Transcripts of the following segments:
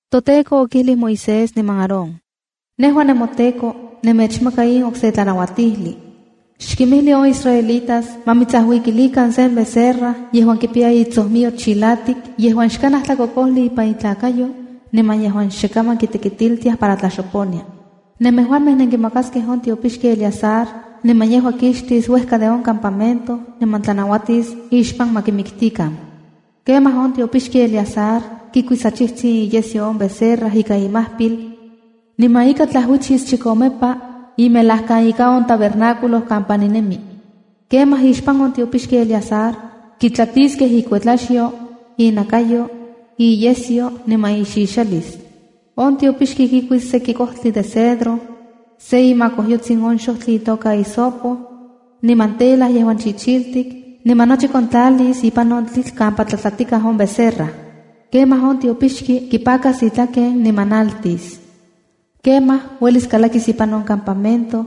ToTEKO okijlij Moisés niman Aarón: “Nejua nemoTEKO, nemechmaka in okse tlanauatijli: Xkimijli on israelitas ma mitsajuikilikan sen becerra yejuan kipiya itsojmiyo chilatik yejuan xkanaj tlakokojli ipan itlakayo, niman yejuan xe kaman kitekitiltiaj para tlaxoponia. Nemejuamej nenkimakaskej on tiopixki Eleazar, niman yejua kixtis uejka de on campamento niman tlanauatis ixpan ma kimiktikan. Kemaj on tiopixki Eleazar kikuis achijtsin iyesyo on becerra ika imajpil, niman ika tlajuichis chikomepa imelajkan ika on yektiopan kampa ninemi. Kemaj ixpan on tiopixki Eleazar, kitlatiskej ikuetlaxyo, innakayo, iyesyo niman ixixalis. On tiopixki kikuis seki kojtli de cedro, se imakojyotsin on xojtli itoka hisopo, niman tela yejuan chichiltik, niman nochi kontlalis ipan on tlitl kampa tlatlatikaj on becerra. ’Kemaj on tiopixki kipakas itlaken, niman naltis. Kemaj uelis kalakis ipan on campamento,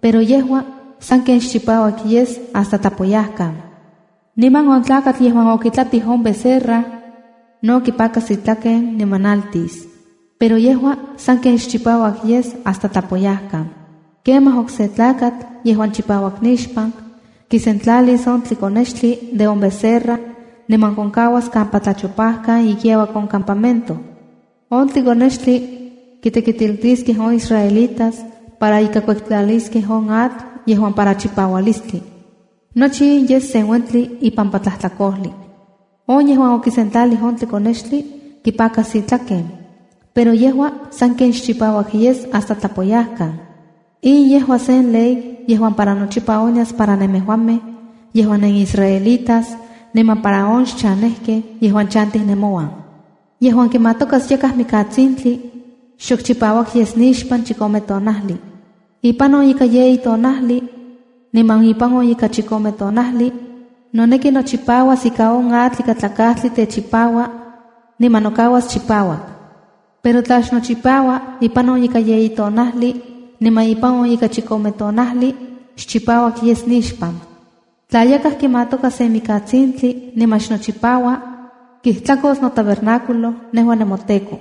pero yejua sanken xchipauak yes hasta tlapoyajkan. Niman on tlakatl yejuan okitlatij on becerra, no kipakas itlaken niman naltis. Pero yejua sanken xchipauak yes hasta tlapoyajkan. Kemaj okse tlakatl, yejuan chipauak nixpan, kisentlalis on tlikonextli de on becerra niman konkauas kampa tlachopajkan ikiauak on campamento. On tlikonextli kitekitiltiskej on israelitas para ika kuektlaliskej on atl yejuan para chipaualistli. Nochi in yes sen uentli ipampa tlajtlakojli. On yejuan okisentlalij on tlikonextli, kipakas itlaken. Pero yejua sanken xchipauak yes hasta tlapoyajkan. In yejua sen ley yejuan para nochipa onyas para nemejuamej yejuan nenisraelitas, niman para on xchanejkej yejuan chantij nemouan. ’Yejuan kimatokas yakaj mikatsintli, xok chipauak yes nixpan chikome tonajli. Ipan on ika yeyi tonajli, niman ipan on ika chikome tonajli noneki nochipauas ika on atl ikatlakajtli techipaua, niman nokauas chipauak. Pero tla xnochipaua ipan on ika yeyi tonajli niman ipan on ika chikome tonajli, xchipauak yes nixpan. Tla yakaj kimatoka sen mikantsintli niman xnochipaua, kijtlakos notabernáculo, nejua nemoTEKO.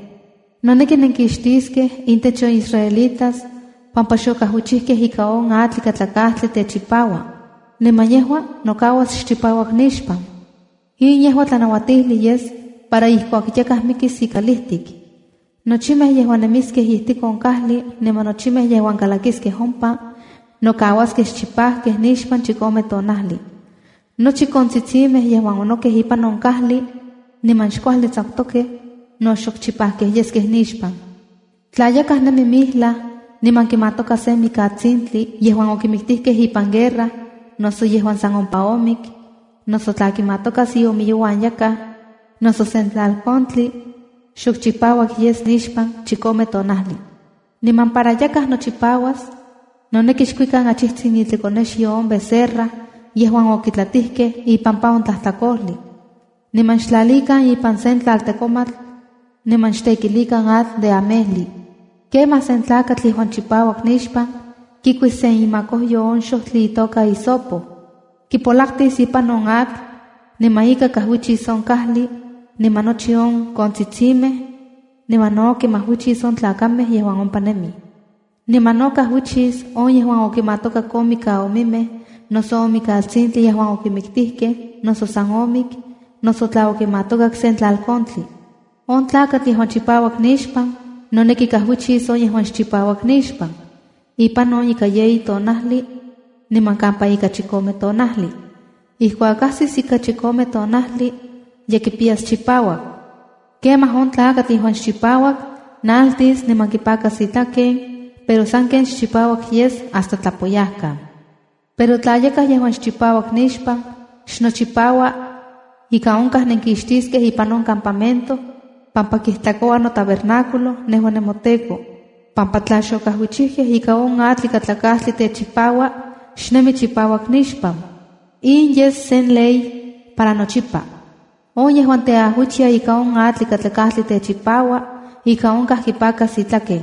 Noneki nenkixtiskej intech on israelitas pampa xokajuichijkej ika on atl ikatlakajtli techipaua, niman yejua nokauas xchipauak nixpan. ’In yejua tlanauatijli yes para ijkuak yakaj mikis ikalijtik. Nochimej yejuan nemiskej ijtik on kajli niman nochimej yejuan kalakiskej ompa, nokauaskej xchipajkej nixpan chikome tonajli. Nochi kontsitsimej yejuan onokej ipan on kajli niman xkuajli tsakutokej no xok chipajkej yeskej nixpan. ’Tla yakaj nemi mijlaj niman kimatoka sen mikatsintli yejuan okimiktijkej ipan guerra, noso yejuan san ompa omik, noso tla kimatokas iomiyouan yakaj, noso sen tlalkontli, xok chipauak yes nixpan chikome tonajli. ’Niman para yakaj nochipauas, noneki xkuikan achijtsin itlikonexyo on becerra yejuan okitlatijkej ipampa on tlajtlakojli, niman xtlalikan ipan sen tlaltekomatl niman xtekilikan atl de amejli. Kemaj sen tlakatl yejuan chipauak nixpan, kikuis sen imakojyo on xojtli itoka hisopo, kipolaktis ipan on atl niman ika kajuichis on kajli, niman nochi on kontsitsimej, niman no kimajuichis on tlakamej yejuan ompa nemij. Niman no kajuichis on yejuan okimatokak on mikaomimej noso on mikatsintli yejuan okimiktijkej, noso san omik, noso tla okimatokak sen tlalkontli. On tlakatl yejuan chipauak nixpan, noneki kajuichis on yejuan xchipauak nixpan, ipan ika yeyi tonajli niman kampa ika chikome tonajli. Ijkuak ajsis ika chikome tonajli ye kipiyas chipauak. Kemaj on tlakatl yejuan xchipauak, naltis niman kipakas itlaken, pero sanken xchipauak yes hasta tlapoyajkan. ’Pero tla yakaj yejuan xchipauak nixpan xnochipaua, ika onkaj nenkixtiskej ipan on campamento, pampa kijtlakoua notabernáculo, nejua nemoTEKO, pampa tla xokajuichijkej ika on atl ikatlakajtli techipaua, xnemi chipauak nixpan. In yes sen ley para nochipa. On yejuan teajuichia ika on atl ikatlakajtli techipaua, ika onkaj kipakas itlaken.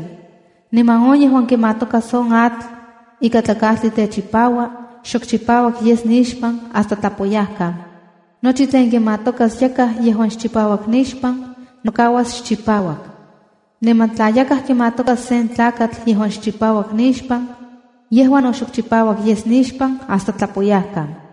Niman on yejuan kimatokas on atl ikatlakajtli techipaua, xok chipauak yes nixpan hasta tlapoyajkan. Nochi tlen kimatokas yakaj yejuan xchipauak nixpan, nokauas xchipauak. Niman tla yakaj kimatokas sen tlakatl yejuan xchipauak nixpan, yejua no xok chipauak yes nixpan hasta tlapoyajkan.”